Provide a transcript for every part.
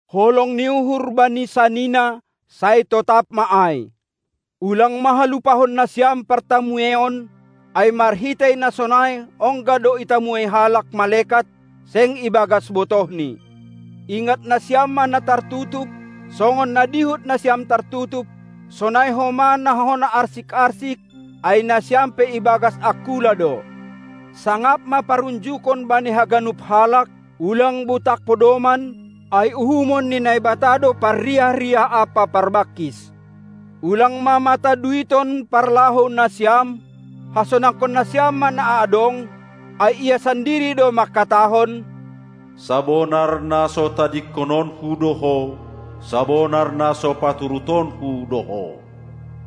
Holong ni uhur bani sanina, sai totap ma ai. Ulang ma halupahon nasiam partamueion, ai marhitei na sonai ongga do itamuei halak malekat, seng ibagas botohni. Ingat nasiam ma na tartutup, songon na dihut nasiam tartutup; sonai homa na hona arsik-arsik, ai nasiam pe ibagas angkula do. Sangap ma parunjukon bani haganup halak, ulang butak podoman, ai uhumon ni Naibata do parriah-riah ampa parbangkis. Ulang ma mata duiton parlahou nasiam, hasonangkon nasiam ma na adong; ai Ia sandiri do mangkatahon: Sabonar na so tadingkononKu do ho, sabonar na so paturutonKu do ho!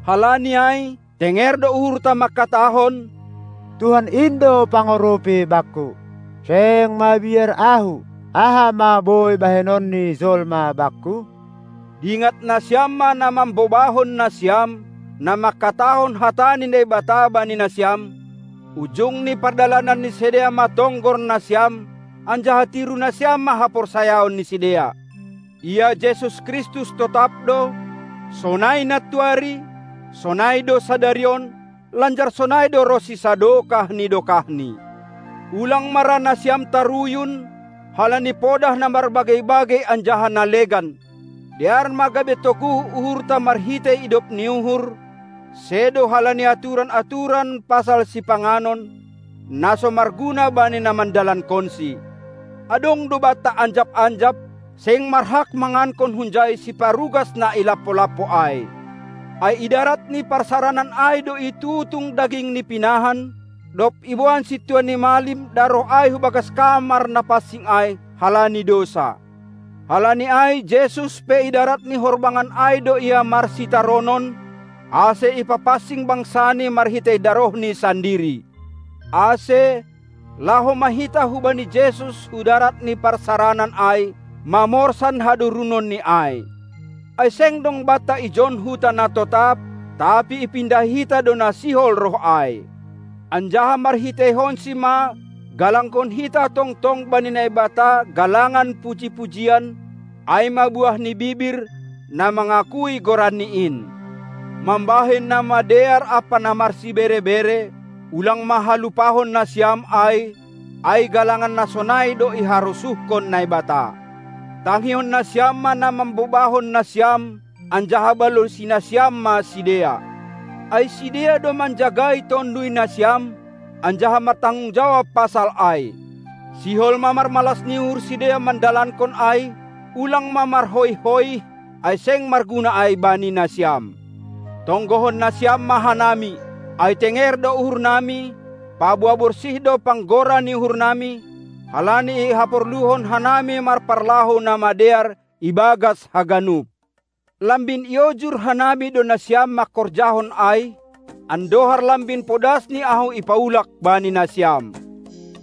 Halani ai, tenger do uhurta mangkatahon: "Tuhan in do pangurupi bakku. Seng mabiar ahu. Aha ma boi bahenon ni jolma bakku?" Dingat nasiam ma na mambobahon nasiam, na mangkatahon hata ni Naibata bani nasiam; ujung ni pardalanan ni sidea ma tonggor nasiam, anjaha tiru nasiam ma haporsayaon ni sidea. Ia Jesus Kristus totap do, sonai nantuari, sonai do sadari on, lanjar sonai do ronsi sadokah ni dokahni. Ulang ma ra nasiam taruyun halani podah na marbagei-bagei anjaha na legan. Dear ma gabe toguh uhurta marhitei idop ni uhur, sedo halani aturan-aturan pasal sipanganon, na so marguna bani na mandalankonsi. Adong do banta anjap-anjap; seng marhak mangankon hunjai siparugas na i lampo-lampo ai. Ai idarat ni parsaranan ai do itutung daging ni pinahan, dob iboan sintua ni malim daroh ai hubagas kamar na pansing ai, halani dousa. Halani ai Jesus pe idarat ni horbangan ai do Ia marsitaronon, ase ipapansing bangsaNi marhitei darohNi sandiri. Ase, laho ma hita hubani Jesus hudarat ni parsaranan ai, mamorsan hadorunonNi ai. Ai seng dong banta ijon huta na totap, tapi ipindahi hita do na sihol roh ai. Anjaha marhiteihonSi ma galangkon hita tongtong bani Naibata galangan puji-pujian, ai ma buah ni bibir, na mangakui goranNi in. Mambahen na madear ampa na marsibere-bere, ulang ma halupahon nasiam ai, ai galangan na sonai do iharosuhkon Naibata. Tangihon nasiam ma na mambobahon nasiam, anjaha balosi nasiam ma sidea. Ai sidea do manjagai tonduy nasiam, anjaha martanggung jawab pasal ai. Sihol ma marmalas ni uhur sidea mandalankon ai, ulang ma marhoih-hoih, ai seng marguna ai bani nasiam. Tonggohon nasiam ma hanami. Ai tenger do uhurnami, paboa borsih do panggora ni uhurnami, halani ihaporluhon hanami marparlahou na madear ibagas haganup. Lambin iojur hanami do nasiam mangkorjahon ai, andohar lambin podasni ahu ipaulak bani nasiam.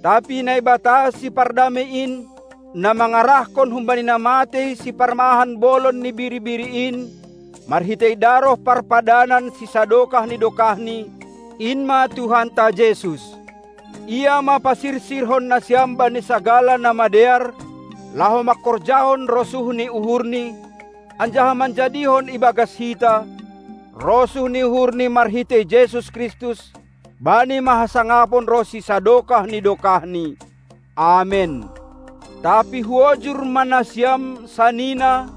Tapi Naibata Sipardamei in, na mangarahkon humbani na matei Siparmahan bolon ni biri-biri in, marhitei daroh parpadanan sisadokah ni dokahni, in ma Tuhanta Jesus. Ia ma pasirsirhon nasiam bani sagala na madear, laho mangkorjahon rosuh ni uhurNi, anjaha manjadihon ibagas hita, rosuh ni uhurNi marhitei Jesus Kristus! Bani ma hasangapon ronsi sadokah ni dokahni! Amen. Tapi huojur ma nasiam, sanina,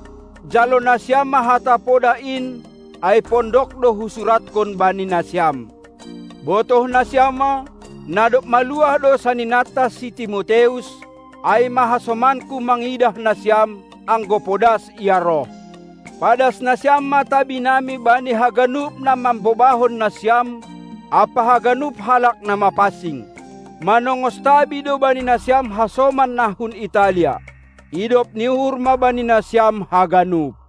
jalo nasiam ma hata podah in ai pondok do husurathon bani nasiam. Botoh nasiam ma, na dob maluah do saninanta si Timoteus; ai ma hasomanku mangidah nasiam, anggo podas ia roh. Padas nasiam ma tabinami bani haganup na mambobahon nasiam ampa haganup halak na mapansing. Manongos tabi do bani nasiam hasoman na hun Italia. Idop ni uhur ma bani nasiam haganup!